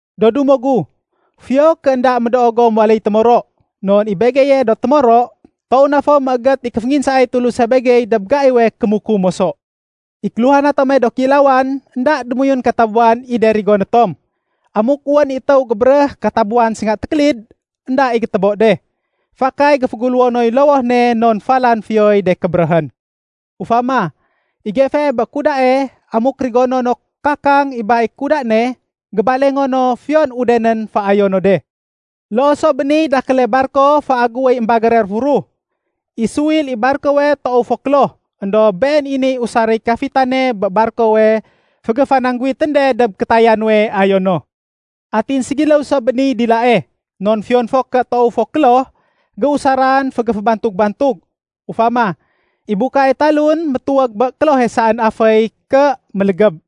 Do dumo gu, fiyo ké énda médoo gom waléy témoro. Non i begeye do témoro, toow na fo méégét i kéfénginsaay Tuluse begey dob gaiwe kémukum moso. I kéluhana tome do kéilawan, énda démoyun katabuwan i de rigoné tom. Amuk wén i étéw gébéréh katabuwan sénga tékélid, énda i gétébo de. Fakay géféguléwo noy lowoh ne non falan fiyoy de kébéréhén. Ufama, i gefee bé kudae, amuk rigono no kakang i ba i kuda ne, gébalengo no fiyon udenén féayo no de. Loo so bé niy dakéle barko féagéwéy émbagére réfuruh. I suwil i barkowe toow fo kloh, éndob been i niy usaréy kafitane bé barkowe fégéfanangguwitén de dob kétaya nuwe ayo no. Atin ségiléw so bé niy dilae. Non fiyon fo ké toow fo kloh, géusaran fégéfébantug-bantug. Ufama, i bukae talun métuwég bé klohe saén aféy ké mélégéb.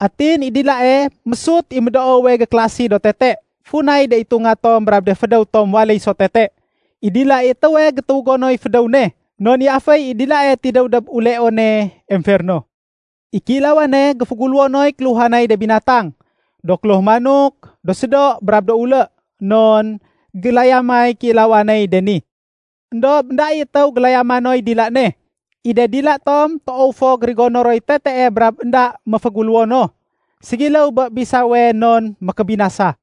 Atin i dilae, mésut i médoowe gékélasi do tete, funay de itunga tom brab de fédéw tom waléy so tete. I dila i étéwe gétuwégo noy fédéw ne, non i aféy i dilae tidéw dob uleone emferno. I kéilawane, géféguléwo noy kéluhanay de binatang, do kloh manok, do sédo, brab do ulé. Non gélayamay kéilawaney de ni. Endob énda i étéw gélayama noy dila ne. I de dila tom toow fo gérigono roy tetee brab énda méféguléwo no. Ségiléw bé bisawe non mékébinasa.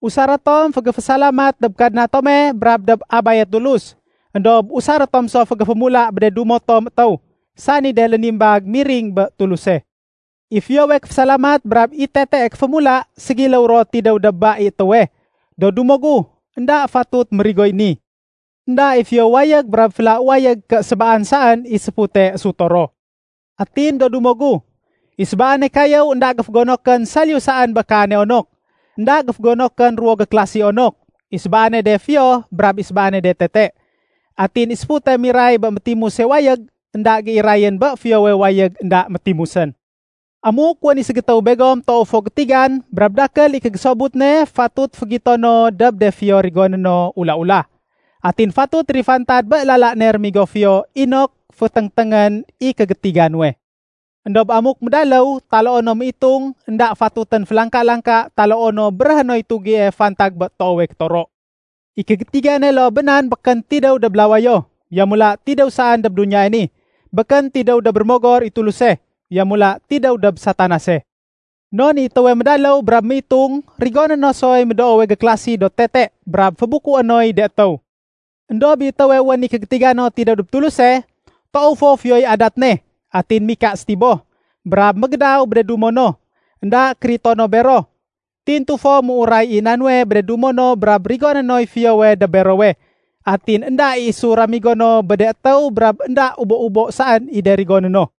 Usaré tom fégéfésalamat dob Kadna tome brab dob Abaye Tulus. Endob usaré tom so fégéfémula bé de dumo tom étéw, sani de lénimbag miring bé Tuluse. I fiyowe kéfésalamat brab i tetee kéfémula, ségiléw ro tidéw dob ba i étéwe. Do dumo gu, énda fatut mérigoy ni. Enda i fiyo wayég brab féla wayég ké sébaan saén i séfute ésuto ro. Atin do dumo gu, i sébaane kayéw énda géfégonokén saliyu saén bé kaane onok. Enda géfégonokén ruwo gékélasi onok, i sébaane de fiyo brab i sébaane de tete. Atin i séfute miray bé métimuse wayég énda géirayén bé fiyowe wayég énda métimusén. Amuk wén i ségétéw begom toow fo gétigan brab dakél i kégésobut ne fatut fégito no dob de fiyo rigoné no ula-ula. Atin fatut térifantad bé lala ne rémigo fiyo inok féténgténgén i kégétiga nuwe. Endob amuk médaléw, taloo no méitung énda fatutén félangka-langka taloo no béréhé noy tugie fantag bé toowe kétoro. I kégétigane loo bé nan békén tidéw dob lawayo. Yamula tidéw saén dob duniyae ni. Békén tidéw dob Rémogor i Tuluse, yamula tidéw dob Satanase. Non i étéwe médaléw brab méitung rigoné no soy médoowe gékélasi do tete brab fébukué noy de étéw. Endob i étéwe wén i kégétiga no tidéw dob Tuluse, toow fo fiyoy adat ne. Atin mika sétiboh. Brab mégédaw bé de dumo no, énda kérito no bero. Tintu fo méuray i na nuwe bé de dumo no brab rigoné noy fiyowe dob berowe. Atin énda i isu ramigo no bé de étéw brab énda ubo-ubo saén i de rigoné no.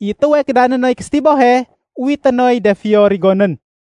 I étéwe kédané noy késétibohe, uwité noy de fiyo rigonén.